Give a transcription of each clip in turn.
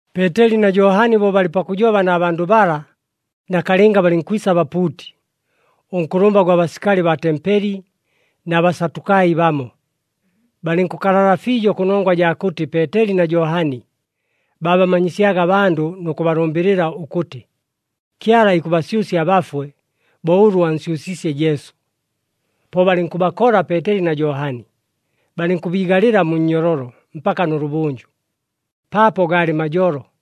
Peeteli na Johani bo balɨ pakʉjoba na bandʉ bala, nakalɨnga balɨnkwisa abapuuti, ʉnkʉlʉmba gwa basikali baa tempeli, na Basatukai bamo. Balɨnkʉkalala fiijo kʉnongwa jaa kʉtɨ Peeteli na Johani babamanyisyaga abandʉ nʉ kʉbalʉmbɨlɨla ʉkʉtɨ, Kyala ikʉbasyʉsya abafwe bo ʉlʉ ansyʉsiisye Jesu. Po balɨnkʉbakola Peeteli na Johani, balɨnkʉbiigalɨla mu nnyololo mpaka nʉlʉbʉnjʉ, paapo gaalɨ majolo.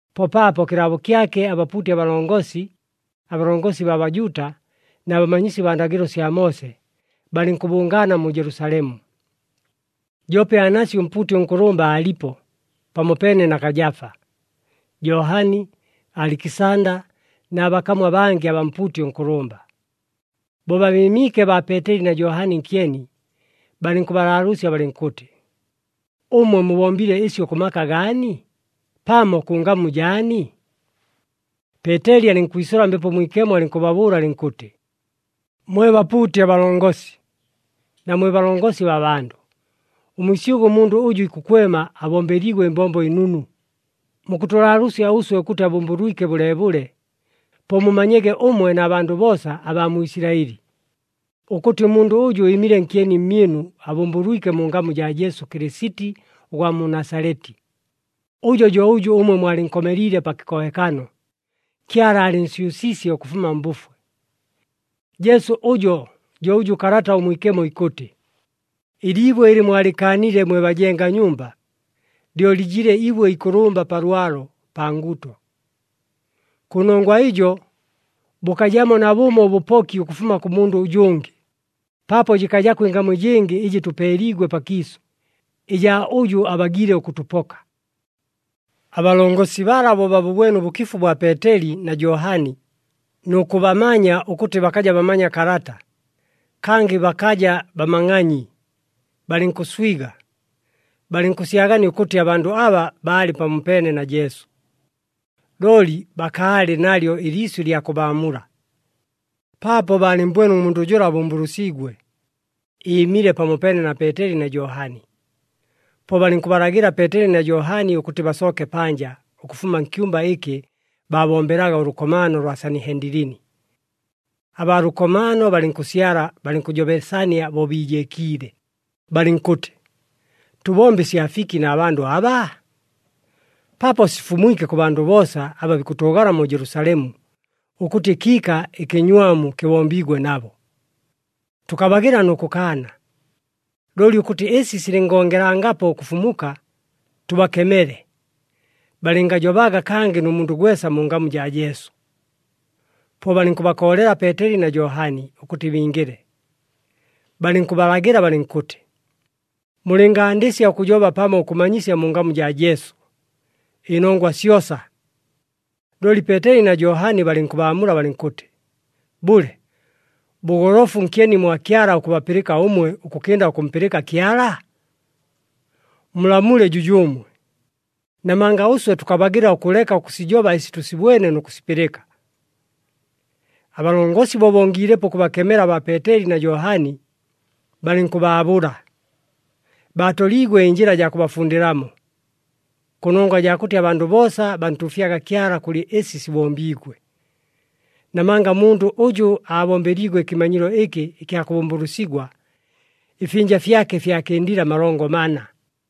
Po paapo kɨlaabo kyake abapuuti abalongosi, abalongosi baa Bajuuta na bamanyisi baa ndagɨlo sya Moose, balɨnkʉbʉngaana mu Jelusalemu. Joope Anasi ʉmpuuti ʉnkʉlʉmba aalipo, pamopeene na Kajafa, Johani, Alikisanda na bakamu abangɨ abaa mpuuti ʉnkʉlʉmba. Bo babɨɨmiike baa Peeteli na Johani nkyeni, balɨnkʉbalaalʉʉsya balɨnkʉtɨ, “Ʉmwe mubombile ɨsyo kʉ maka gaani, pamo kʉ ngamu jaani?” Peeteli alɨnkwisʉla Mbepo Mwikemo, alɨnkʉbabʉʉla alɨnkʉtɨ, “Mwe bapuuti abalongosi, na mwe balongosi baa bandʉ! Ʉmwisyʉgʉ, ʉmundʉ ʉjʉ ikʉkwema abombeliigwe ɨmbombo ɨnunu, mukʉtʉlaalʉʉsya ʉswe ʉkʉtɨ abʉmbʉlwike bʉleebʉle. Po mumanyege ʉmwe na bandʉ boosa abaa mu Isilaɨli, ʉkʉtɨ ʉmundʉ ʉjʉ ɨɨmile nkyeni mmyɨnu abʉmbʉlwike mu ngamu jaa Jesu Kɨlɨsiti ʉgwa mu Nasaleti. Ʉjo jo ʉjʉ ʉmwe mwalɨnkomeliile pa kɨkohekano, Kyala aalɨnsyʉsiisye ʉkʉfuma mbʉfwe. Jesu ʉjo jo ʉjʉ Kalata ʉMwikemo ikʉtɨ, ‘Ɨliibwe ɨlɨ mwalɨkaanile mwe bajenga nyumba, lyo lɨjile ibwe ikʉlʉmba pa lwalo, pa nguto.’ “Kʉnongwa ɨjo, bʉkajamo nabʉmo ʉbʉpoki ʉkʉfuma kʉ mundʉ ʉjʉngɨ, paapo jɨkajako ɨngamu ɨjɨngɨ, ɨjɨ tʉpeeliigwe pakiisʉ, ɨjaa ʉjʉ abagiile ʉkʉtʉpoka.” Abalongosi bala bo babʉbwene ʉbʉkifu bwa Peeteli na Johani nʉ kʉbamanya ʉkʉtɨ bakaja bamanya kalata, kangɨ bakaja bamangʼanyi, balɨnkʉswiga, balɨnkʉsyagania ʉkʉtɨ abandʉ aba baalɨ pamopeene na Jesu. Looli bakaalɨ nalyo ɨliisyʉ ɨlya kʉbaamula, paapo baalɨmmbwene ʉmundʉ jʉla abʉmbʉlʉsiigwe, ɨɨmile pamopeene na Peeteli na Johani. Po balɨnkʉbalagɨla Peeteli na Johani ʉkʉtɨ basooke panja ʉkʉfuma nkyumba ɨkɨ baabombelaga ʉlʉkomaano lwa Sanihendilini. Abaa lʉkomaano balɨnkʉsyala, balɨnkʉjobesania bo biijeekiile, balɨnkʉtɨ, “Tʉbombe ɨsya fiki na bandʉ aba? Paapo sifumwike kʉ bandʉ boosa aba bikʉtʉʉgala mu Jelusalemu, ʉkʉtɨ ɨkiika ɨkɨnywamu kɨbombiigwe nabo. Tʉkabagɨla nʉ kʉkaana. Looli ʉkʉtɨ ɨsi silɨngongelangapo ʉkʉfumuka, tʉbakemele, balɨngajobaga kangɨ nʉ mundʉ gwesa mu ngamu jaa Jesu.” Po balɨnkʉbakoolela Peeteli na Johani ʉkʉtɨ bingɨle, balɨnkʉbalagɨla balɨnkʉtɨ, “Mulɨngandɨsya ʉkʉjoba pamo ʉkʉmanyisya mu ngamu jaa Jesu, ɨnongwa syosa!” Looli Peeteli na Johani balɨnkʉbaamula balɨnkʉtɨ, “Bʉle, bʉgolofu nkyeni mwa Kyala ʉkʉbapɨlɨka ʉmwe ʉkʉkɨnda ʉkʉmpɨlɨka Kyala? Mulamule jʉjʉʉmwe, namanga ʉswe tʉkabagɨla ʉkʉleka ʉkʉsijoba ɨsi tʉsibwene nʉ kʉsipɨlɨka.” Abalongosi bo bongiilepo ʉkʉbakemela baa Peeteli na Johani, balɨnkʉbaabʉla. Baatoliigwe ɨnjɨla jaa kʉbafundɨlamo, kʉnongwa jaa kʉtɨ abandʉ boosa bantuufyaga Kyala kʉlɨ ɨsi sibombiigwe. Namanga ʉmundʉ ʉjʉ aabombeliigwe ɨkɨmanyilo ɨkɨ ɨkya kʉbʉmbʉlʉsigwa, ɨfyɨnja fyake fyakɨndile amalongo mana.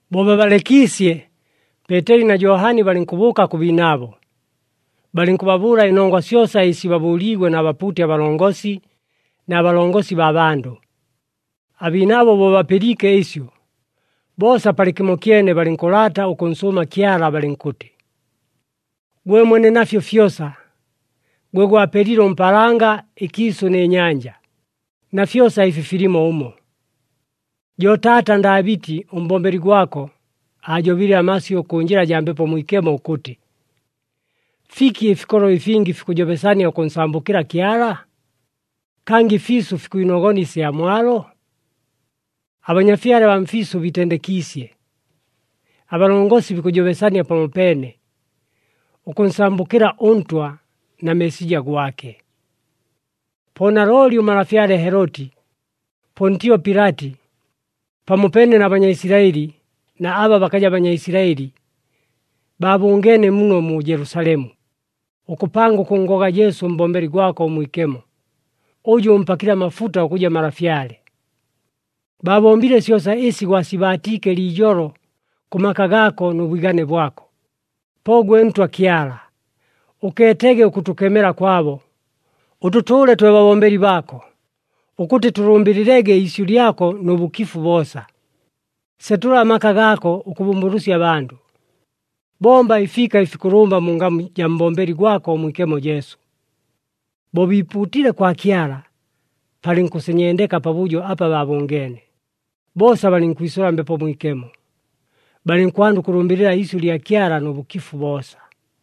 Bo babalekiisye, Peeteli na Johani balɨnkʉbʉʉka kʉ biinaabo, balɨnkʉbabʉʉla ɨnongwa syosa ɨsi baabʉʉliigwe na bapuuti abalongosi na balongosi baa bandʉ. Abiinaabo bo bapɨliike ɨsyo, boosa palɨkɨmokyene balɨnkʉlaata ʉkʉnsʉʉma Kyala, balɨnkʉtɨ, “Gwe Mwene nafyo fyosa, gwe gwapelile ʉmpaalanga, ɨkiisʉ nɨ nyanja, na fyosa ɨfi filimo ʉmo. Jo taata Ndaabɨti, ʉmbombeli gwako, aajobile amasyʉ kʉ njɨla jaa Mbepo Mwikemo ʉkʉtɨ, ‘Fiki ɨfikolo ɨfingi fikʉjobesania ʉkʉnsambʉkɨla Kyala? Kangɨ ɨfiisʉ fikwinogona ɨsya mwalo? Abanyafyale abaa mfiisʉ biitendekiisye, abalongosi bikʉjobesania pamopeene, ʉkʉnsambʉkɨla ʉNtwa, na Meesija gwake.’ “Po nalooli ʉmalafyale Heloti, Pontio Pilati, pamopeene na Banyaisilaɨli na aba bakaja Banyaisilaɨli, baabʉngeene muno mu Jelusalemu, ʉkʉpanga ʉkʉnngoga Jesu ʉmbombeli gwako ʉmwikemo, ʉjʉ ʉmpakile amafuta ʉkʉja malafyale. Baabombile syosa ɨsi gwasibaatiike liijolo kʉ maka gaako nʉ bwigane bwako. Po gwe Ntwa Kyala, ʉkeetege ʉkʉtʉkemela kwabo, ʉtʉtʉʉle twe babombeli baako ʉkʉtɨ tʉlʉmbɨlɨlege iisyʉ lyako nʉ bʉkifu boosa. Setʉla amaka gaako ʉkʉbʉmbʉlʉsya abandʉ. Bomba ɨfiika ɨfikʉlʉmba mu ngamu jaa mbombeli gwako ʉmwikemo Jesu.” Bo biipuutile kwa Kyala, palɨnkʉsenyendeka pabʉjo apa baabʉngeene. Boosa balɨnkwisʉla Mbepo Mwikemo, balɨnkwanda ʉkʉlʉmbɨlɨla iisyʉ lya Kyala nʉ bʉkifu boosa.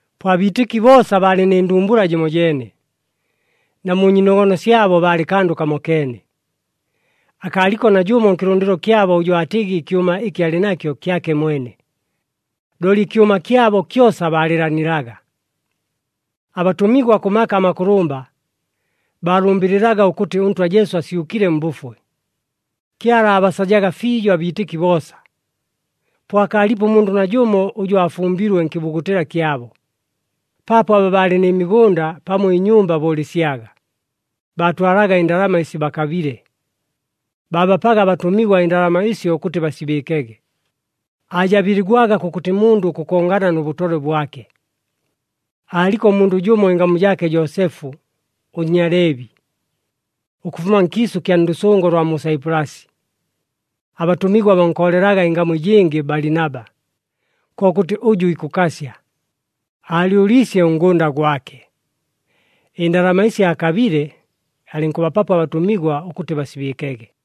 Po abiitɨki boosa baalɨ nɨ ndumbula jɨmojeene na mu nyiinogono syabo baalɨ kandʉ kamokeene. Akaaliko najʉmo nkɨlʉndɨlo kyabo ʉjʉ aatɨgɨ ɨkyʉma ɨkɨ alɨ nakyo kyake mwene, looli ɨkyʉma kyabo kyosa baalɨɨlanilaga. Abatʉmigwa, kʉ maka amakʉlʉmba, baalʉmbɨlɨlaga ʉkʉtɨ ʉNtwa Jesu asyʉkile mbʉfwe. Kyala aabasajaga fiijo abiitɨki boosa. Po akaalipo ʉmundʉ najʉmo ʉjʉ aafumbilwe nkɨbugutɨla kyabo, paapo aba baalɨ nɨ migʉnda pamo ɨnyumba bʉʉlɨsyaga, baatwalaga ɨndalama ɨsi bakabile. Baabapaga abatʉmigwa ɨndalama ɨsyo ʉkʉtɨ basibɨɨkege, aajabɨligwaga kʉkʉtɨ mundʉ ʉkʉkongana nʉ bʉtolwe bwake. Aaliko ʉmundʉ jʉmo ɨngamu jaake Joosefu, ʉNnyaleebi, ʉkʉfuma nkiisʉ kya ndʉsʉngo lwa mu Saipulasi. Abatʉmigwa bankoolelaga ɨngamu ɨjɨngɨ Balinaba, kokʉtɨ ʉjʉ ikʉkasya. Aalyʉliisye ʉngʉnda gwake. Ɨndalama ɨsi aakabile, alɨnkʉbapapo abatʉmigwa ʉkʉtɨ basibɨɨkege.